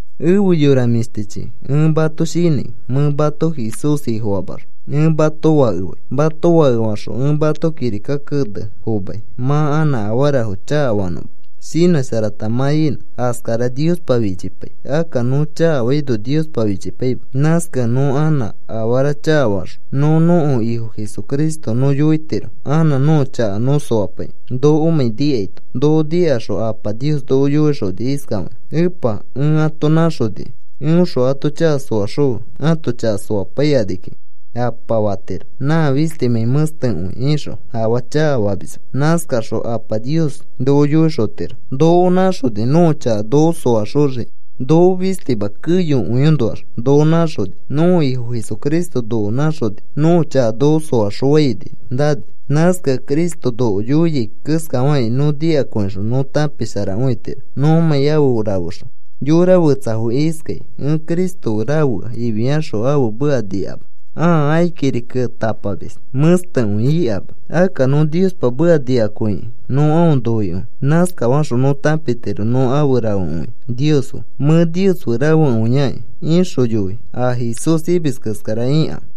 Efe yora mĩshtichi, ẽ mato shinãi. Mẽ mato Jesús Ifofamaxõ ẽ mato fakefai. Mato fakefaxõ ẽ mato kirika kene fomai, mã anã afarafo chakafanõma, shinãsharata mã inõ. Askara Niospa fichipai. Akka nõ chakafaino Niospa fichipaima. Nãskakẽ nõ anã afara chakafaxõ nõ nõko Ifo Jesucristo nõ yoitiro anã nõko chaka nõ soapaikĩ, nokomãi nikaito. Noko nikaxõ Apa Nios noko yoixoni iskafakĩ: “Epa, ẽ ato nãxoni. Eõxõ ato chaka soaxõfe, ãto chaka soapaikani kiki,” Apa fatiro. Nã fistimãi mẽstekõi ixõ, afaa chakafamisma. Nãskaxõ Apa Nios noko yoixotiro. Noko nãxoni nõko chaka noko soaxoxiki. Noko fistima, keyokõiõnoax noko nãxoni. Nõko Ifo Jesucristo noko nãxoni. Nõko chaka noko soaxõfaini nani. Nãskakẽ Cristo noko yoiai keskafakĩ nõ nikakõixõ nõ tãpisharakõitiro nõmãi afe rafexõ. Yora fetsafo iskai: “Ẽ Cristo fe rafea,” ifiaxõ ãfe meka nikama, ãa akikiri kẽtapamis, mẽstekõi ikama. Akka nõ Niospa meka nikakõikĩ nõ aõ noikõi. Nãskafaxõ nõ tãpitiro nõ afe rafekõia, Nios fe. “Mẽ Nios fe rafekõiaki,” ixõ yoi, a Jesús imis keskara ikãfe.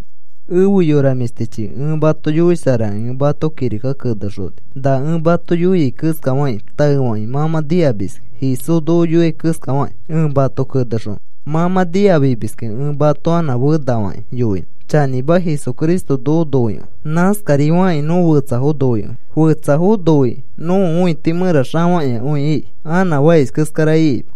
Efe yora mĩshtichi, ẽ mato yoisharakĩ ẽ mato kirika kenexoni. Na ẽ mato yoiai keskafakĩ taefakĩ mã mã nikamiskĩ. Jesús noko yoia keskafakĩ ẽ mato kenexonõ. Mã mã nikafimiskẽ, ẽ mato anã fenafakĩ yoinõ chanĩma. Jesucristo noko noikõi. Nãskari fakĩ nõ fetsafo noikõi. Fetsafo noikĩ, nõko õiti mẽra xafakĩakõi iki. Anã fakish keskara ikima.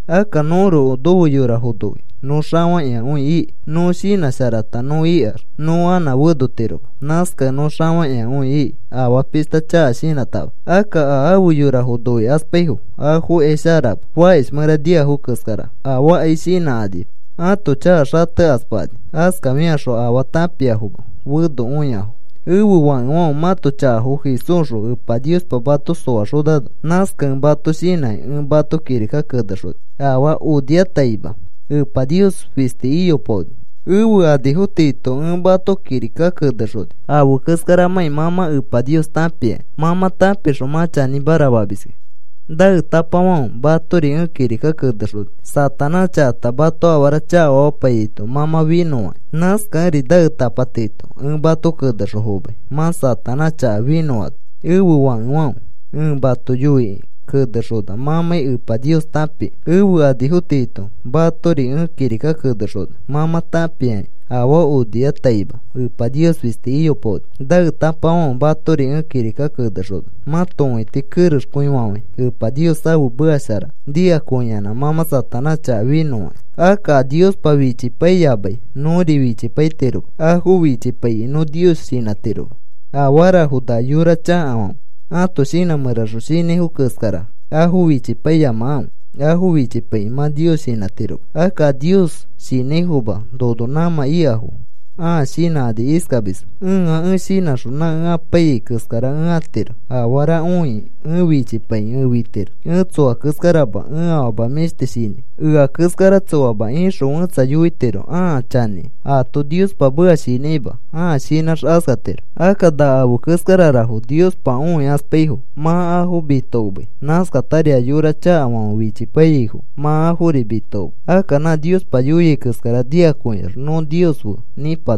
Akka nõroko nofe yorafo noi, nõ xafakĩakõi iki. Nõ shinãsharata nõ ikax, nõ anã fenotiroma. Nãskakẽ nõ xafakĩakõi iki, afaa pishta chaka shinãtama. Akka a afe yorafo noikaspaifo, afokai sharama. Fakish mẽra niafo keskara. Afaakai shinãkanima. Ãto chaka xatekaspakani. Askafikaxõ afaa tãpiafoma, fenokõiafo. Efe fakefãfe, mãto chakafo Jesúsxõ Epa Niospa mato soaxonano, nãskakẽ ẽ mato shinãkĩ ẽ mato kirika kenexoni. Afaa oniataima Epa Nios fisti iyopaoni. Efe anifo tiito, ẽ mato kirika kenexoni, afe keskaramãki mã mã Epa Nios tãpiakĩ. Mã mã tãpixõ mã chanĩmara famiski. Naetapafãfe, matori ẽ kirika kenexoni, Satanás chakata mato afara chakafamapaiyaito mã mã finõfakĩ. Nãskakẽri naetapa tiito ẽ mato kenexõ fomai, mã Satanás chaka finõano. Efe fakefãfe, ẽ mato yoikĩ kenexona mãmãi Epa Nios tãpikẽ. Efe anifo tiito, matori ẽ kirika kenexona, mã mã tãpiakĩ, afaa oniyataima Epa Nios fisti iyopaoni. Naetapafãfe, matori ẽ kirika kenexona, mãto õiti kerexkõifafãi Epa Nios ãfe meka shara nikakõiyanã mã mã Satanás chaka finõfakĩ. Akka a Niospa fichipaiyamai, nõri fichipaitiroma. Afo fichipaikĩ nõ Nios shinãtiroma. Afarafo na yora chakafãfe ãto shinã mẽraxõ shinãifo keskara afo fichipaiyamakãfe. Afo fichipaikĩ mã Nios shinãtiroma. Akka a Nios shinãifoma nono nãmã ikafo ãa shinãkani iskamisfo: “Ẽa ẽ shinãxõ nã ẽ apaiyai keskara ẽ atiro. Afara õikĩ ẽ fichipaikĩ ẽ fitiro. Ẽ tsoa keskarama. Ẽ afama mĩshti shinãi. Ea keskara tsoama,” ixõ fẽtsa yoitiro ãa chanĩkĩ. Aato Niospa meka shinãima, ãa shinãx askatiro. Akka na afe keskararafo Niospa õikaspaifo mã afo mitokomei. Nãskatari a yora chakafãfe fichipaiyaifo mã afori mitokomei. Akka nã Niospa yoiai keskara nikakõiax nõ Nios fe nĩpanaka.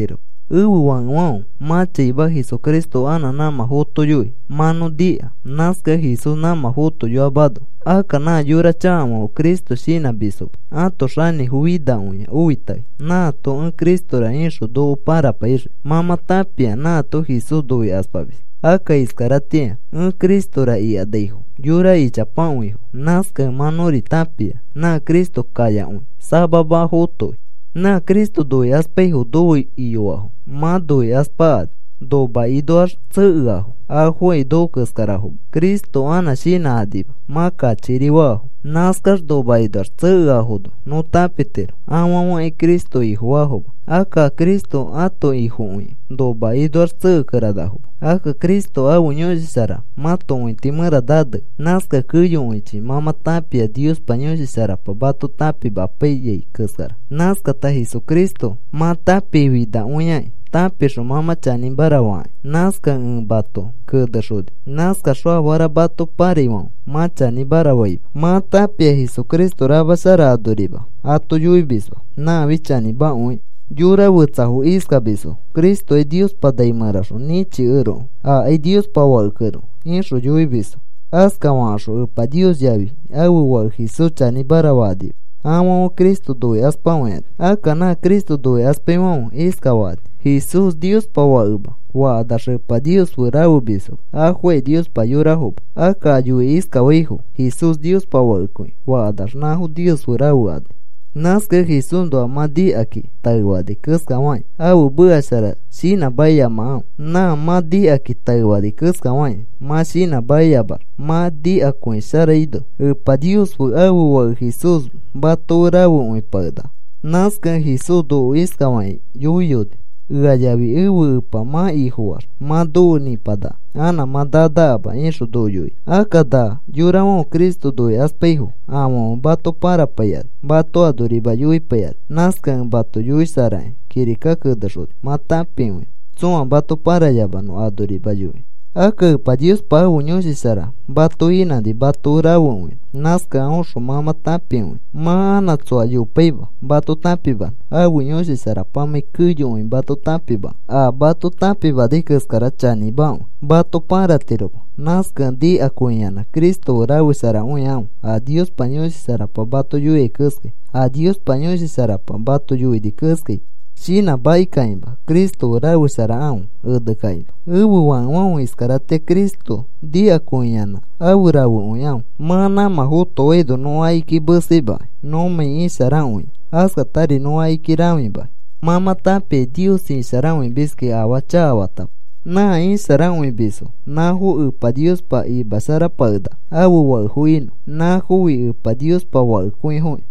Efe fakefãfe, mã chaima Jesucristo anã nãmã fotoiyoi mã nõ nika. Nãskakẽ Jesús nãmã fotoyoamano, akka nã yora chakafãfe Cristo shinãmisfoma ãto xanĩfo finakõia oi taei. Nãato, “Ẽ Cristora,” ixõ noko pãrapaixii. Mã mã tãpia nãato Jesús noikaspamis. Akka iskaratĩa, “Ẽ Cristora,” ikanaifo yora ichapakõifo. Nãskakẽ mã nõri tãpia nã Cristo kayakõi samama fotoi. Nã Cristo noikaspaifo nofe iyoafo, mã noikaspakani nomakinoax tsekeafo. Afokai noko keskarafoma. Cristo anã shinãkanima, mã kachikiri faafo. Nãskax nomakinoax tsekeafono nõ tãpitiro afãfekai Cristo Ifofaafoma. Akka a Cristo ãto Ifokõikẽ nomakinoax tsekekeranafoma. Akka Cristo ãfe Yõshi Shara mãto õiti mẽra nanea. Nãskakẽ keyokõichi mã mã tãpia Niospa Yõshi Sharapa mato tãpimapaiyai keskara. Nãskata Jesucristo mã tãpikĩ finakõiakĩ. Tãpixõ mã mã chanĩmara fakĩ. Nãskakẽ ẽ mato kenexoni. Nãskaxõ afara mato pãraifãfe mã chanĩmara faima. Mã tãpia Jesucristo ramashara anorima ato yoimisma, nãfi chanĩmakõikĩ. Yora fetsafo iskamisfo: “Cristokai Niospa nai mẽraxõ nĩchinikeroko, akai Niospa Fakekẽroko,” ixõ yoimisfo. Askafakaxõ Epa Nios yafi ãfe Fake Jesús chanĩmara fakanima. Afãfe Cristo noikaspakõikani. Akka nã Cristo noikaspaifãfe iskafakani: “Jesús Niospa Fakema,” fakanax Epa Nios fe rafemisfoma. Afokai Niospa yorafoma. Akka a yoikĩ iskafaifo: “Jesús Niospa Fakekõi,” fakanax nãfo Nios fe rafekani. Nãskakẽ Jesúsnoa mã nikakĩ taefani keskafakĩ, ãfe meka shara shinãmakiyamakãfe. Nã mã nikakĩ taefani keskafakĩ, mã shinãmakiyamax mã nikakõisharaino Epa Nios fe ãfe Fake Jesús mato fe rafekõipakenaka. Nãskakẽ Jesús noko iskafakĩ yoiyoni: “Ea yafi ẽfe Epa mã Ifofaax, mã nofe nĩpanaka, anã mã nanakama,” ixõ noko yoini. Akka na yorafãfe Cristo noikaspaifo afãfe mato pãrapaikani. Mato anorima yoipaikani. Nãskakẽ ẽ mato yoisharakĩ kirika kenexoni mã tãpikõinõ tsõa mato pãrayamanõ anorima yoikĩ. Akka Epa Niospa ãfe Yõshi Shara mato inãni mato fe rafekõinõ. Nãskakẽ aõxõ mã mã tãpikõia. Mã anã tsoa yopaima mato tãpimanõ, ãfe Yõshi Sharapamãi keyokõi mato tãpimakẽ. A mato tãpimanai keskara chanĩmakõi, mato pãratiroma. Nãskakẽ nikakõiyanã Cristo fe rafesharakõikãfe, a Niospa Yõshi Sharapa mato yoiai keskai. A Niospa Yõshi Sharapa mato yoini keskai shinãmakikakĩma Cristo fe rafesharakãfe enekakĩma. Ẽfe fakefãfe, iskaratĩa Cristo nikakõiyanã afe rafekõikãfe, mã nãmã fotofaino nõ akiki meseimakai nõmãi isharakõiax. Askatari nõ akiki rãfimakai. Mã mã tãpiakĩ Nios isharakõimiskĩ afaa chakafatama. Nã isharakõimisfo nãfo Epa Niospa imasharapakenaka ãfe fakefo inõ. Nafofi Epa Niospa fakekõifokĩ.